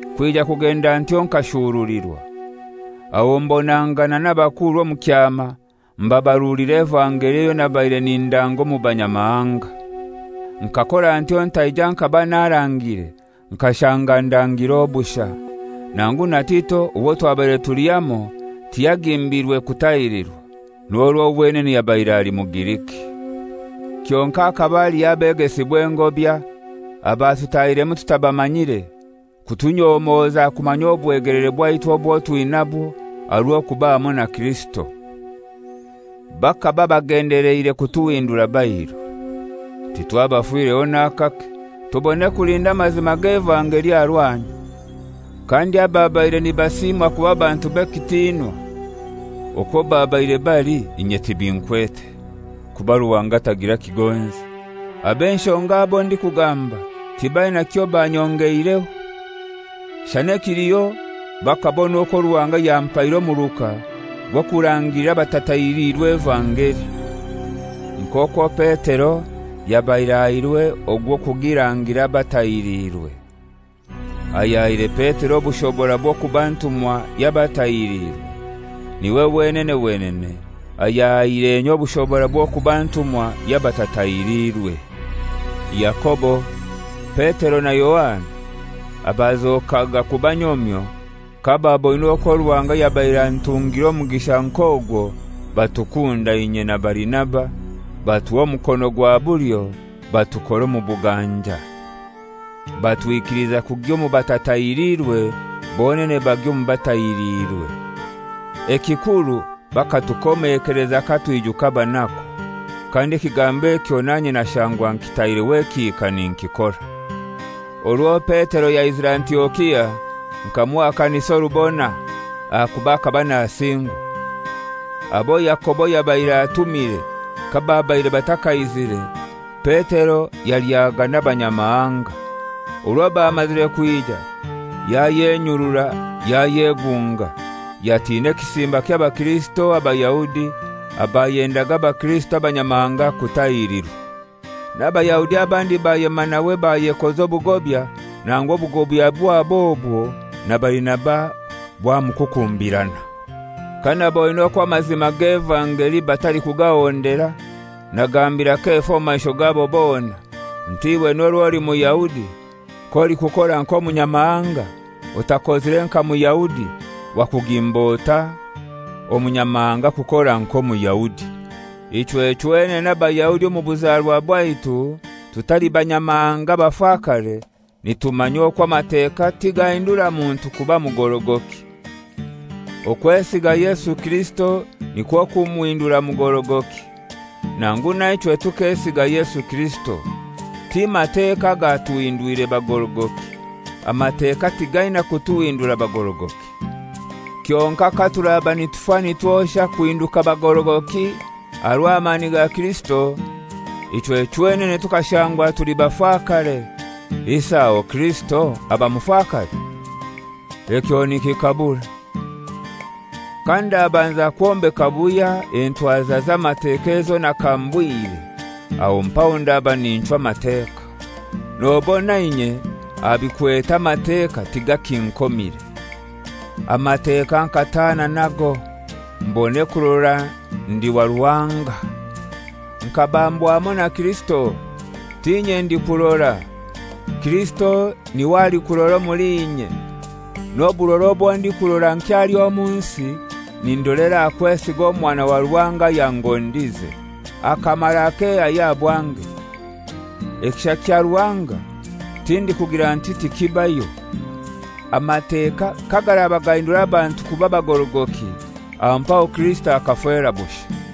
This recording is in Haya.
Kwija kugenda ntyo nkashurulirwa. Aho mbonangana n'abakuru omu kyama mbabarulira evangeli eyo nabaire nindanga omu Banyamahanga. Nkakora ntyo ntaija nkaba narangire nkashanga ndangire obushai. Nangu na Tito owo twabaire tuli hamoi, tiyagimbirwe kutahirirwa, n'orwo wenene yabaire ali Mugiriki. Kyonkai hakaba haliho abegesibwa engobya abatutahiremu tutabamanyire kutunyomoza kumanya obwegeleere bwaitu obwo twinabwo aha rw'okuba hamoi na Kirisito. Bakaba bagendeleire kutuhindura bairu. Titwabafireho n'akake, tubone kulinda amazima g'evangeli aha rwanyu. Kandi ababaire nibasimwa kuba bantu b'ekitinwa, (okwo babaire bali, inye tibinkwete; kuba Ruhanga tagira kigonzi), ab'enshonga abo ndikugamba, tibaina kyobanyongeireho. Shana ekiliho bakabona okwo Ruhanga yampaire omuruka gw'okurangira abatatahiliirwe evangeli, nk'okwo Petero yabaire ahairwe ogw'okugirangira abatahiriirwe. Ayahaire Petero obushobora bw'okuba ntumwa y'abatahiriirwe, niwe wenene wenene ayahaire inye obushobora bw'okuba ntumwa y'abatatahiriirwe. Yakobo, Petero na Yohana abazokaga kuba nyomyo, kababoine okwo Ruhanga yabaire antungire omugisha nk'ogwo, batukunda inye na Barinaba, batuha omukono gwa bulyo batukora omu buganja. Batwikiliza kugya omu batatahiriirwe, bonene bagya omu batahiriirwe. Ekikuru bakatukomeleza katwijuka abaanaku; kandi ekigambo ekyo nanye nashangwa nkitaireho ekihika ninkikora. Orwo Petero yaizire Antiokia nkamuhakanisa orubona, ahakuba akaba nasingwa. Abo Yakobo yabaire atumire kababaire batakaizire, Petero yalyaga n'abanyamahanga. Orwo bamazire kwija yayenyurura yayegunga, yatina ekisimba ky'abakirisito Abayahudi abayendaga abakirisito abanyamahanga kutahirirwa. N'Abayahudi abandi bayema nawe bayekoza obugobya, nangu obugobya bwabo obwo na Barinaba bwamukukumbirana. Kanaboine okwo amazima g'evangeli batalikugahondera, nagambira Kefa omu maisho gabo bona nti, «Iwe n'orwo oli Muyahudi, k'olikukora nk'Omunyamahanga, otakozire nka Muyahudi, wakugimba otai Omunyamahanga kukora nk'Omuyahudi?» Ichwe chwenene Abayahudi omu buzarwa bwaitu, tutali banyamahanga abafakare, nitumanya okwo Amateka tigahindura muntu kuba mugorogoki. Okwesiga Yesu Kirisito nikwo kumuhindura mugorogoki. Nangu na ichwe tukesiga Yesu Kirisito. Ti Mateka agatuhindwire bagorogoki. Amateka tigaina kutuhindura bagorogoki. Kyonkai katuraba nitufa nitwosha kuhinduka bagorogoki aha rw'amani ga Kirisito, ichwe chwenene tukashangwa tuli bafakare, isi aho Kirisito aba mufakare? Ekyo nikikabure! Kandabanza kwombeka buhya entwaza z'Amateka ezo nakambwire, aho mpaho ndaba ninchwa Amateka. Nobona inye aha bikwete Amateka tigakinkomire. Amateka nkataana nago, mbone kurora ndi wa Ruhanga. Nkabambwa hamoi na Kirisito. T'inye ndikurora; Kirisito niwe alikurora omuli inye. N'oburora obwo ndikurora nkyali omu nsi, nindolera aha kwesiga Omwana wa Ruhanga ayangondize, akamara akehayo aha bwange. Ekisha kya Ruhanga tindikugira nti tikibayo; Amateka kagaraba gahindura abantu kuba bagorogoki, aho mpaho Kirisito akafera bushai.